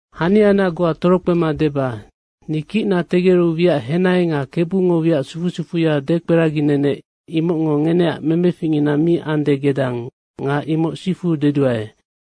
Haniana goa torokpema deba, ni kicna tegeru wiac henai nga Kebungo wiac sufu sufuya dekperaginenec, imocngo ngeneac memeficngina mi ande gedang nga imoc sifu deduae.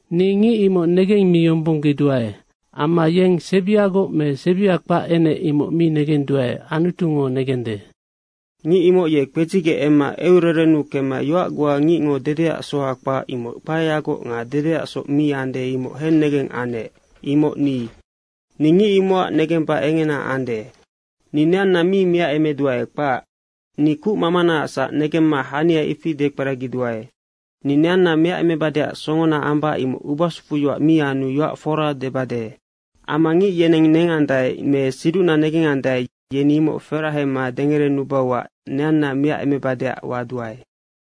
Ni ngic imoc negemmiyombonggeduae. Amma yeng sebiagoc me sebia kpac enec imoc mi negenduae, Anutungo negende. Ngic imoc ye kpedzigec emma eucererennu kemma yoac goa ngicngo dedeac soha kpac, imoc kpaeyagoc nga dedeasoc mi ande, imoc hennegeng anec. Imoc ni. Ni ngic imocac negemba engena ande. Ni neanna mi miacemeduae, kpac. Ni kucmamanaacsac negemma haniana ifi dekperagiduae. Ni neanna miacemebadeac songona ambac imoc ubasufuyoac mi anu yoac fora debade. Amma ngic yeneng nengandae me siducna negengandae, yeni imoc ferahema dengerenubauac neanna miacemebadeac waduae.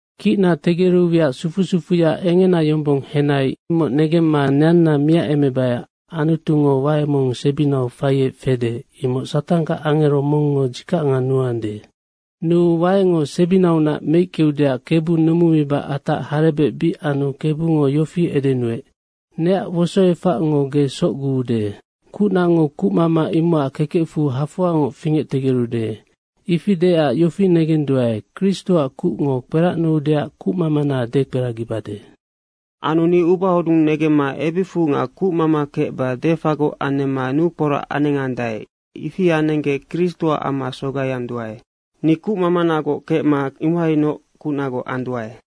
Kicna tegeru wiac sufu sufuya engena yombong henai, imoc negemma neanna miacemebaiac Anutungo wae mong sebinau faiec fede, imoc Satanggac angero mongngo dzikacngo nuande. Nuu waengo sebinaunac meickeudeac Kebu numumiba atac harebec bic anu Kebungo yofi edenuec, “Neac wosoefacngo ge socguude. Nocac kucnango kucmama imocac kekecfu hafoangoc fingectegerude.” ifi deecac yofi negenduae, Kristoac kucngo kperacnuudeac kucmamana dekperagibade. Anu ni ubahodung negemma ebicfu nga kucmama kecba defagoc anemma nukporac anengandae, ifi anenggec Kristoac amma sogaianduae. Ni kucmamagoc kecma imohainoc kucnagoc anduae.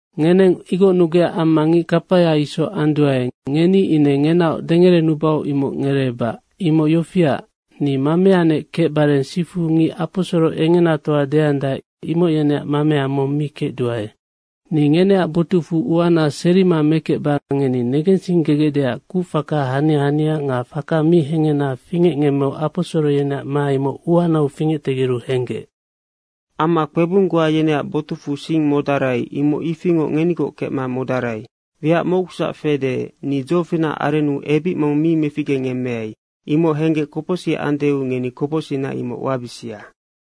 Ngeneng igocnugecac amma ngic kapaya isoc anduae. Ngeni ine ngenaoc dengerenubau imoc ngereebac. Imoc yofiac, ni mameanec kecbare sifu ngic aposoro engenatoa deandae, imoc yeneac mamea mong mi kecduae. Ni ngeneac botucfu uana serima mekecba ngeni negensinggegecdeac kucfaka hania hania nga faka mi hehena fingecngemmeu aposoro yeneac ma imoc uanau fingectegeru henggec. Amma kpebung goa yeneac botucfu sing modarai, imoc ifingoc ngenigoc kecma modarai. Wiac mocgusac fede, ni dzofinacac arennu ebic mong mi meficgengemmeai. Imoc henggec kopocsic andeu ngeni kopocsicna imoc wabisia.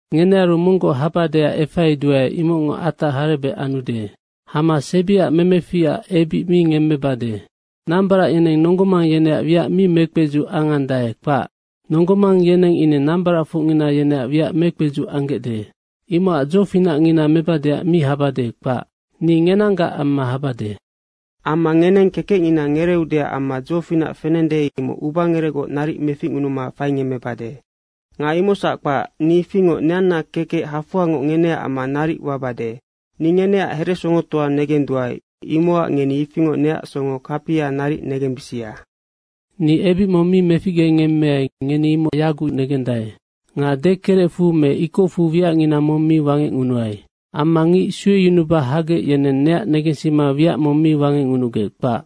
Ngenearu monggoc habadeac efaiduae, imocngo atac harebec anude. Hama sebiac memeficac ebic mi ngemmebade. Nambarac yeneng nonggo mang yeneac wiac mi mekpedzuc anggecde, kpac. Nonggo mang yeneng ine nambaracfocngina yeneac wiac mekpedzuc anggecde. Imocac dzofinacngina mebadeac mi habade, kpac. Ni ngenanggac amma habade. Amma ngeneng kekecngina ngereeudeac amma dzofinac fenende, imoc ubangerecgoc naric meficngunuma faingemmebade. Nga imocsac kpac, ni ifingoc neanna kekec hafoangoc ngeneac amma naric wabade. Ni ngeneac heresongotoa negenduae, imocac ngeni ifingoc neac songo kapia naric negembisia. Ni ebic mong mi meficgengemmeai, ngeni imoc yagucnoc negendae. Nga dekerecfu me ikocfu wiacngina mong mi wangecngunuai. Amma ngic sueyunuba hagec, yeneng neac negensima wiac mong mi wangecngunugec, kpac.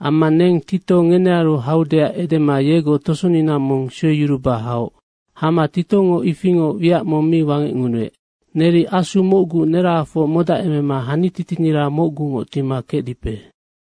Amma neng Tito ngenearu haudeac edema yegoc tosonina mong sueyuruba haoc. Hama Titongo ifingoc wiac mong mi wangecngunuec. Neri Asu mocgu nerahafoc modacemema hanititinira mocgungoc tima kecdipe.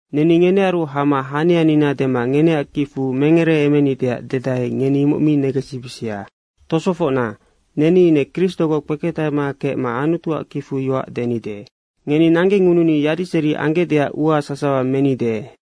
Neni ngenearu hama hanianina dema ngeneac kicfu mengereemenideac dedae, ngeni imoc mi negensibisia. Tosofocna, neni ine Kristogoc kpeketahema kecma Anutuac kicfu yoac denide. Ngeni nanggengununi yadiseri anggecdeac ua sasawa menide.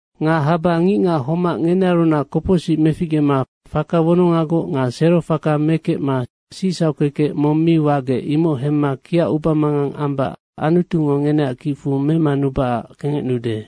Nga haba ngicngac homac ngenearunac kopocsic meficgema faka wonongagoc nga sero faka mekecma sicsauc kekec mong mi wagec, imoc hemma kiac ubamangang amba Anutungo ngeneac kicfu memanubacac kengecnude.